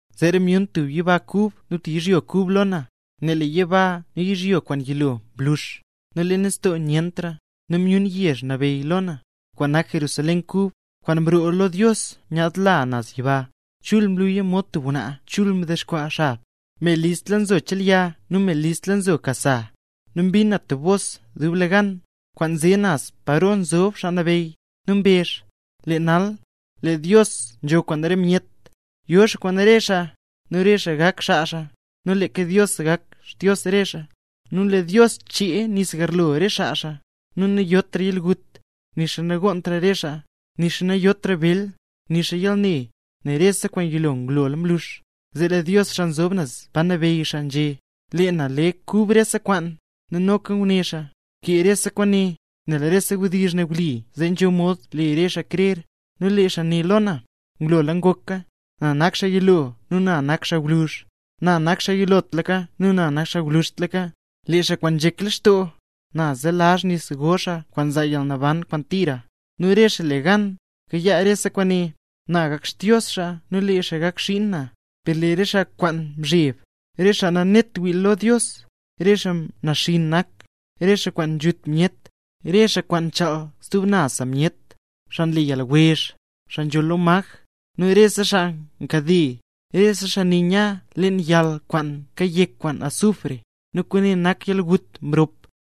Zeera myun tub yiba kub nu tub yizhyo kub lo na, nel lee yiba nu yizhyo kwaan yilo mlux, nu lee nistoo nyentra. Nu myun yezh nambey lo na, kwaan nak Jerusalén kub, kwaan mroo lo Dios nyaadla naz yiba. Chul nluya mod tub ngwnaa chul ndexkwaa xab, me listla nzo chelya nu me listla nzo ka sa. Nu mbin na tub bos dublegan, kwaan nze naz paro nzob xaa nabeyy, nu mbezh: —Lee nal, lee Dios nzho kwaan re myet. Yo xaa kwaan re xaa, nu re xaa gak xaa xaa, nu leeka Dios gak Xdios re xaa. Nu lee Dios chee re nis garlo re xaa xaa, nu nayotra yalgut, nixa nagonntra re xaa, nixa nayotra bel, nixa yalne; nel rese kwaan yilo ngulola mlux. Zee lee Dios, xaa nzob naz pa nabeyy xaa, nzhé: —Lee na le kub rese kwaan. Nu noka nguné xaa: —Bkee rese kwaane, nel rese wdizh ne wli zee nzho mod le xaa krera. Nu lee xaa né lo na: —Ngulola ngoka. Na nak xaa yilo nu na nak xaa gwluzh, na nak xaa yilotlaka nu na nak xaa gwluzhtlaka. Lee xaa kwaan nzhek lextoo, na zelazh nis go xaa kwaan nzaa yalnaban kwaan tira. Nu re xaa le gan, kayaa rese kwaane, na gak Xdios xaa nu lee xaa gak xiin na. Per lee re xaa kwaan nzheb, re xaa nanet wii lo Dios, re xaa naxinn nak, re xaa kwaan nzhut myet, re xaa kwaan nchaal stub naz sa myet, xaa nle yalwezh, xaa nzholl lo maj, nu rese xaa nkade. Rese xaa ne nya leen yal kwaan kayek kwaan azufre, nu kwaane nak yalgut mrop.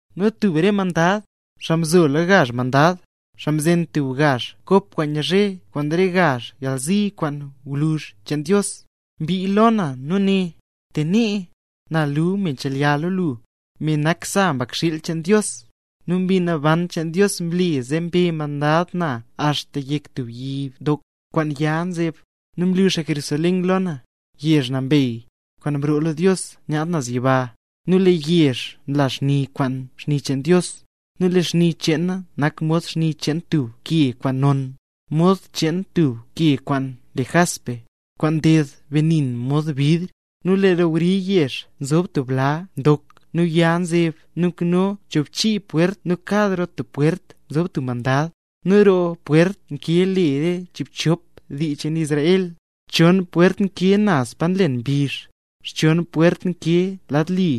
Nu tub re mandad, xaa mzo lo gazh mandad, xaa mzen tub lo gazh kop kwaan nyazhe kwaan re gazh yalzi kwaan gwluzh cheen Dios, mbii lo na nu né: —Te nee, na luu me chelya lo lu, me nak sa Mbakxiil cheen Dios. Nu Mbi Naban cheen Dios mle zee mbe mandad na axta yek tub yi ndok, kwaan ya nzeb; nu mlu xaa Jerusalén lo na, yezh nambey, kwaan mroo lo Dios nyaadla naz yiba. Nu lee yezh nla xni kwaan xni cheen Dios; nu lee xni cheena nak mod xni cheen tub ke kwaan non, mod cheen tub ke kwaan le jaspe, kwaan nded benin mod bidr. Nu lee roo wri yezh nzob tub bla ndok nu ya nzeb nu nkano chiibchop pwert nu kad roo tub pwert nzo tub mandad; nu lee roo pwert nkee le re chiibchop dii cheen Israel. Chon pwert nkee naz pa nlen mbizh, xchon pwert nkee lad li,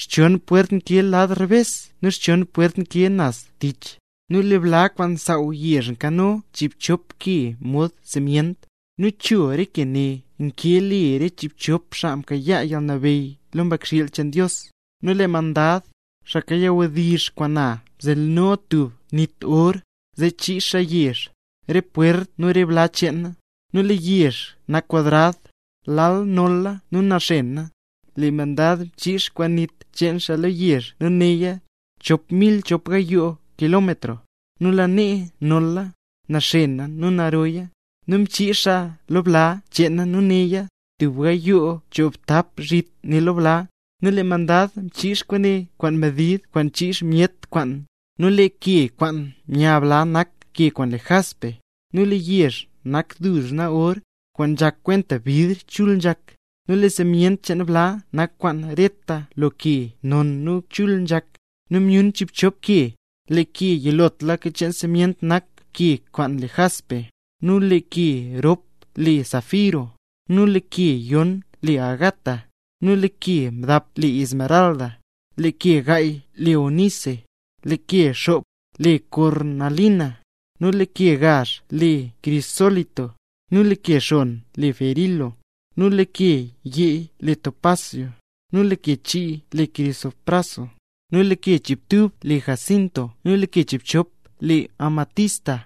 xchon pwert nkee lad rebes nu xchon pwert nkee naz tich. Nu lee bla kwaan nsaaw yezh nkano chiibchop ke mod simyent, nu cho re ke ne, nkee le re chiibchop xaa mkayaa yalnabeyy lo Mbakxiil cheen Dios. Nu lee mandad, xaa kayawdizh kwaan na, nzheno tub nit or, zee chiix xaa yezh, re pwert nu bla cheena. Nu lee yezh nak kwadrad, lal nolla nu naxena. Lee mandad mchiix kwaan nit cheen xaa lo yezh nu neya chop mil chop gayoo kilómetro, nu lanee nolla, naxena nu naroya. Nu mchiix xaa lo bla cheena nu neya tub gayoo choobtap zhit ne lo bla, nu lee mandad mchiix kwaane kwaan medid kwaan nchiix myet kwaan. Nu lee ke kwaan nya bla nak ke kwaan le jaspe, nu lee yezh nak duzna or, kwaan nzhak kwenta bidr chul nzhak. Nu lee simyent cheen bla nak kwaan reta lo ke non nu chul nzhak; nu myun chiibchop ke: lee ke yilotlaka cheen simyent nak ke kwaan le jaspe, nu lee ke rop le safiro, nu lee ke yon le ágata, nu lee ke mdap le esmeralda, lee ke gaay le ónise, lee ke xop le kornalina, nu lee ke gazh le krisólito, nu lee ke xon le berilo, nu lee ke yeey le topasio, nu lee ke chii le krisopraso, nu lee ke chiibtub le jasinto nu lee ke chiibchop le amatista.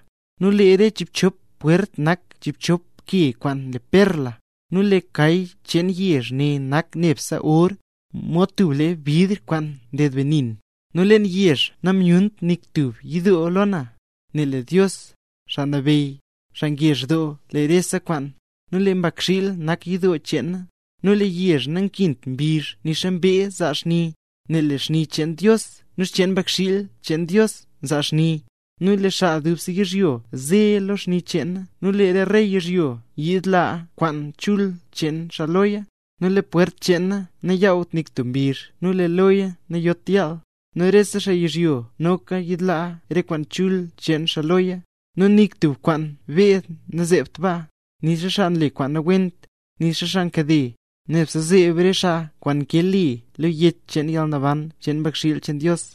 Nu lee re chiibchop pwert nak chiibchop ke kwaan le perla. Nu lee kay cheen yezh nak nebse or, mod tub lee bidr kwaan nded benin. Nu leen yezh namyunt nik tub yidoo lo na, nel lee Dios, Xaa Nabeyy, xaa ngezh doo lo rese kwaan, nu lee Mbakxiil nak yidoo cheena. Nu lee yezh nankint mbizh nixa mbee zaa xni, nel lee xni cheen Dios nu xcheen Mbakxiil cheen Dios nzaa xni. Nu lee re xaa dubse yizhyo ze lo xni cheena nu lee re rey yizhyo nyiidlaa kwaan chul cheen xaa loya. Nu lee pwert cheena nayaawt nik tub mbizh nu lee loya nayot yaal. Nu rese xaa yizhyo, noka nyiidlaa re kwaan chul cheen xaa loya. Nu nik tub kwaan beed nazeebt baa, nixa xaa nle kwaan nawent, nixa xaa nkade; nebse zeeb re xaa kwaan nkee le lo Yech cheen Yalnaban cheen Mbakxiil cheen Dios.